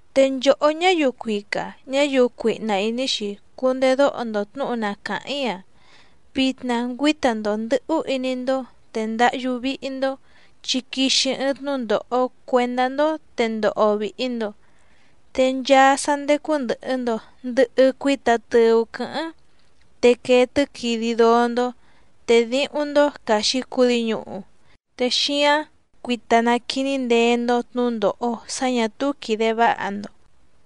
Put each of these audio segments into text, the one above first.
Te nchòhó ñáyiu cuica ñáyiu cuihna ìní‑xi cundedóho‑ndo tnǔhu na càháⁿ‑í‑a. Vitna ngüíta‑ndo ndɨ̌hú iní‑ndó, te ndáhyú víhí‑ndó, chi quixi ɨɨⁿ tnúndòho cuendá‑ndó te ndoho vìhi‑ndo. Te nchaa sá ndécú ndɨ̀hɨ‑ndo ndɨhɨ cuita tɨu quɨ̌hɨ́ⁿ, te quee tɨ́quidi dóó‑ndó, te díhúⁿ‑ndó caxi cudi ñùhu. Te xíáⁿ cuita naquiní ndeé‑ndó tnǔndòho sá ñà túú quìde váha‑ndo.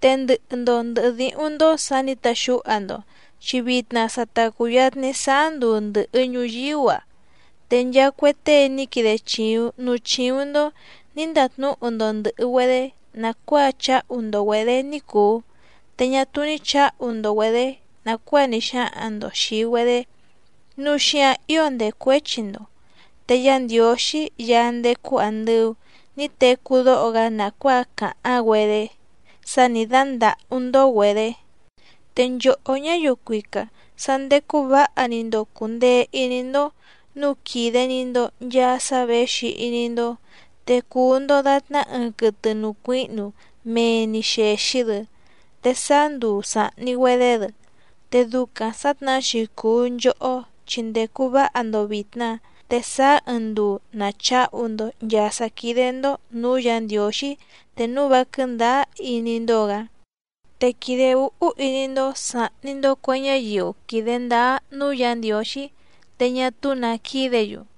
Te ndɨhɨ‑ndo ndɨ̀hɨ díhúⁿ‑ndó sǎ nǐ taxúha‑ndo, chi vitna sa ta cùyatni sáá nduu ndɨ̀hɨ ñuyíú‑a. Te nchaa cue tée ní quide chìuⁿ núú chíúⁿ‑ndó nǐ ndatnúhu‑ndo ndɨ̀hɨ‑güedé nàcuáa cháhu‑ndo‑güedě ní cùu, te ñá túú ní chǎhu‑ndo‑güedě nàcuáa ní xáhaⁿ‑ndo xìi‑güedé, núu xíǎⁿ ío ndècuéchi‑ndo. Te Yá Ndiǒxí Yaá ndécú àndɨu ní tecú dóho‑gá nàcuáa càháⁿ‑güedé sá nì dándàhú‑ndó‑güedě. Te nchòhó ñáyiu cuica, sá ndécú vǎha‑ni‑ndo cùndee iní‑ndó, núu quìde‑ni‑ndo nchaa sá věxi iní‑ndó. Te cùu‑ndo datná ɨɨⁿ quɨtɨ nùcuíhnu mee‑ni xèxi‑dɨ, te sàá nduu sàhni‑güedé‑dɨ. Te ducaⁿ sǎtnahá‑xi cùu nchohó chi ndècu váha‑ndo vìtna, te sáá ɨɨⁿ nduu nàcháhu‑ndo nchàa sá quídé‑ndó nǔú Yǎ Ndiǒxí te núu vá quɨ̀ndáá iní‑ndó‑gǎ. Te quìde úhú iní‑ndó sàhni‑ndo cue ñáyiu quìde ndáá núú Yǎ Ndiǒxí, te ñá túú nǎ quídě‑yu.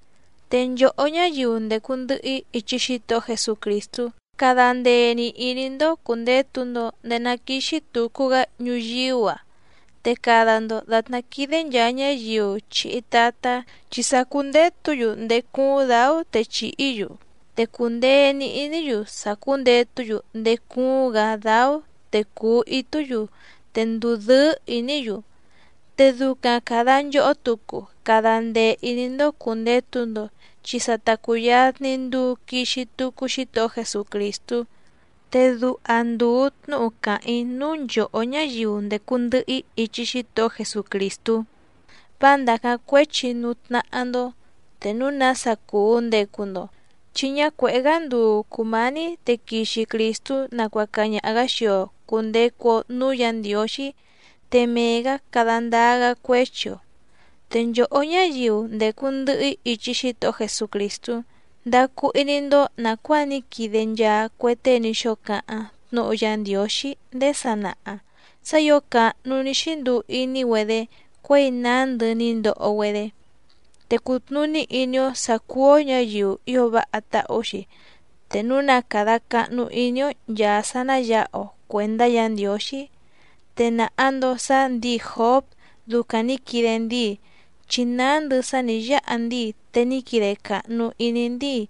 Te nchòhó ñáyiu ndècu ndɨhɨ‑í ichi Xítohó Jesucrìstú, cada ndee‑ni ìní‑ndó cùndetu‑ndo ndéé ná quìxi tucu‑gá ñuyíú‑a, te cada‑ndo dàtná quídé nchàa ñáyiu chìhi tatá chi sàcúndetú‑yu ndéé cúúⁿ dǎú te chìhí‑yu. Te cùndee‑ni iní‑yu sàcúndetú‑yu ndéé cúúⁿ‑gǎ dáú te cùu itú‑yu, te ndùdɨ́ɨ́ ìní‑yu. Te ducaⁿ càda nchohó tucu cada ndee ìní‑ndó cùndetu‑ndo, chi sa ta cùyatni nduu quixi tucu Xítohó Jesucrìstú. Te duha ndùu tnúhu càháⁿ‑í núú nchòhó ñáyiu ndècu ndɨhɨ‑í ichi Xítohó Jesucrìstú, vá ndàcáⁿ cuéchi núú tnáhá‑ndó te núu nása cùu ndecu‑ndo, chi ñá cuèhé‑gá nduu cùmání te quixi Crìstú nacuaca ñaha‑gǎ xii‑o cùndecu‑o núú Yǎ Ndiǒxí, te mee‑gǎ cada ndáá‑gá cuéchi‑o. Te nchòhó ñáyiu ndècu ndɨhɨ‑í ichi Xítohó Jesucrìstú, ndacu iní‑ndó nàcuáa ní quide nchaa cue tée ní xóo cáháⁿ tnúhu Yá Ndiǒxí ndéé sanaha sá ǐo càhnu ní xínduu iní‑güedé cuěi nándɨ ní ndoho‑güedé. Te cùtnuní iní‑ó sǎ cúú‑ó ñǎyiu ío váha táhú‑xi te núu na càda cahnu iní‑ó nchàa sá ná yǎha‑o cuèndá Yǎ Ndiǒxí. Te nàha‑ndo sá ndǐi Jǒb ducaⁿ nǐ quide ndíi, chi nándɨ sá nǐ yáha ndíi te ní quide càhnu iní ndíi.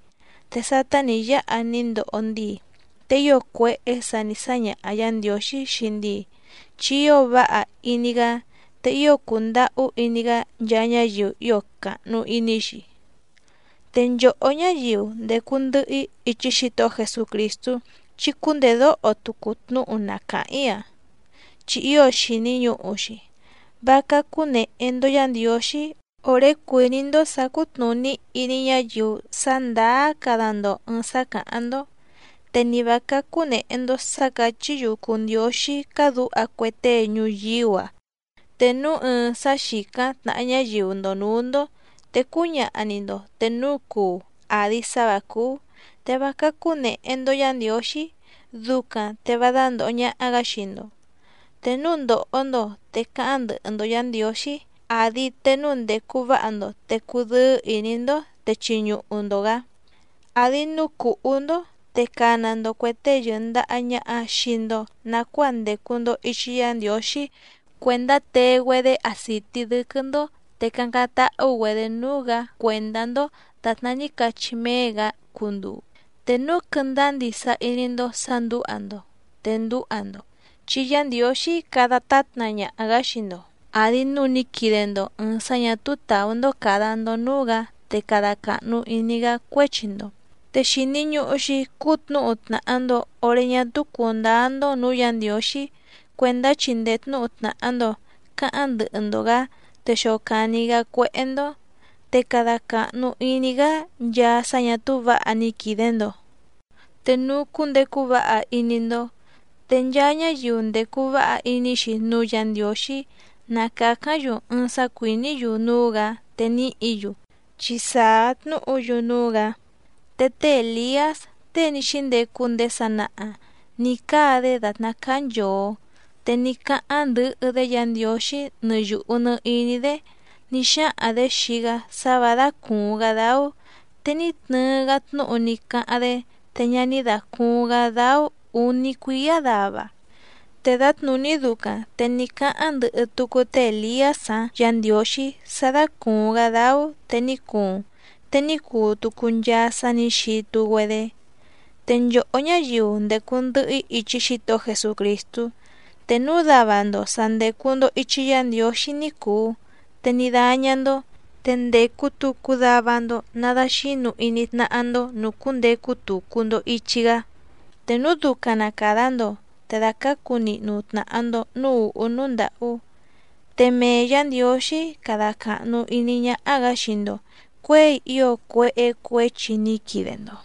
Te sátá nǐ yáha ní ndoho ndíi, te ío cuéhé sǎ nǐ sáñaha Yǎ Ndiǒxí xii ndíi. Chi ío váha iní‑gá te ío cùndahú iní‑gá nchaa ñáyiu ío càhnu iní‑xi. Te nchòhó ñáyiu ndècu ndɨhɨ‑í ichi Xítohó Jesucrìstú, chí cúndèdóho tucu tnúhu na càháⁿ‑í‑a, chi ío xìni ñuhu‑xi. Vá cácú nèhe‑ndo Yá Ndiǒxí òré cuìní‑ndó sǎ cútnùní iní ñáyiu sá ndàá cada‑ndo ɨ̀ɨⁿ sá càháⁿ‑ndó. Te nì vá cácú nèhe‑ndo sá càchí‑yu cùu ndióxí cádǔha cue tée ñuyíú‑a. Te núu ɨɨⁿ sá xìcáⁿ tnàha ñáyiu‑ndo nǔú‑ndó te cúñaha‑ni‑ndo te núu cuu àdi sá vǎ cúú. Te vá cácú nèhe‑ndo Yá Ndiǒxí, ducaⁿ te vá dándòho ñaha‑gá xii‑ndo. Te núu ndòho‑ndo te cáháⁿ ndɨhɨ‑ndo Yǎ Ndiǒxí, àdi te núu ndècu váha‑ndo te cudɨ́ɨ́ ìní‑ndó te chiñuhu‑ndo‑gǎ, àdi núu cùhú‑ndó te cana‑ndo cuè tée yɨ̀ndaha ñaha xii‑ndo nacuáa ndècu‑ndo ichi Yá Ndiǒxí cuèndá tee‑güedé acìtí dɨ́quɨ́‑ndó, te cácáⁿ táhú‑güedě núú‑gǎ cuèndá‑ndó dàtná ní cachí méé‑gǎ cunduu. Te núu quɨndáá ndisa iní‑ndó sǎ ndǔha‑ndo, te ndúha‑ndo chi Yá Ndiǒxí cada tátna ñaha‑gǎ xii‑ndo, àdi núu ní quide‑ndo ɨ̀ɨⁿ sá ñà túú tàú‑ndó càda‑ndo núú‑gǎ te cada càhnu iní‑gá cuéchi‑ndo. Te xìni ñuhu‑xi cútnǔhu tnàha‑ndo oré ñá túú cùndáá‑ndó nǔú Yǎ Ndiǒxí cuèndá chindee tnǔhu tnàha‑ndo cáháⁿ ndɨhɨ‑ndo‑gǎ te xocàni‑gá cuéhé‑ndó, te cada càhnu iní‑gá nchaa sá ñà túú vǎha ní quide‑ndo te núu cundecu váha iní‑ndó. Te nchaa ñáyiu ndècu váha iní‑xi núú Yǎ Ndiǒxí na càcáⁿ‑yu ɨɨⁿ sá cuìní‑yu núú‑gǎ te nìhí‑yu, chi sàá tnúhu‑yu núú‑gǎ. Te té Èliás, tée ní xíndecu ndéé sanaha nǐ cáa‑dé dàtná cáá nchòo. Te ní cáháⁿ ndɨhɨ‑dé Yǎ Ndiǒxí nɨ yùhu nɨ iní‑dé ní xáhaⁿ‑dě xii‑gá sá vǎ dácùuⁿ‑gá dáú, te ní tnɨɨ‑gá tnúhu ní cáháⁿ‑dé, te ñá ní dàcuuⁿ‑gá dáú ǔní cuíá dava. Te dǎtnùní ducaⁿ te ní cáháⁿ ndɨhɨ tucu té Èliás‑áⁿ Yǎ Ndiǒxí sá dácùuⁿ‑gá dáú te ní cuuⁿ, te ní cuu tucu nchaa sá nǐ xitu‑güedé. Te nchòhó ñáyiu ndècu ndɨhɨ‑í ichi Xítohó Jesucrìstú, te núu dava‑ndo sà ndecu‑ndo ichi Yá Ndiǒxí ní cùu te ní dáñá‑ndó, te ndècu tucu dava‑ndo nadaxǐnu iní tnáhá‑ndó nùcúndecu tucu‑ndo ìchi‑gá, te núu ducaⁿ na càda‑ndo te dàcácu nihnu tnàha‑ndo núú ùhú núú ndàhú, te mee Yǎ Ndiǒxí cada càhnu iní ñáhá‑gǎ xii‑ndo cuěi ío cuéhé cuěchi ní quide‑ndo.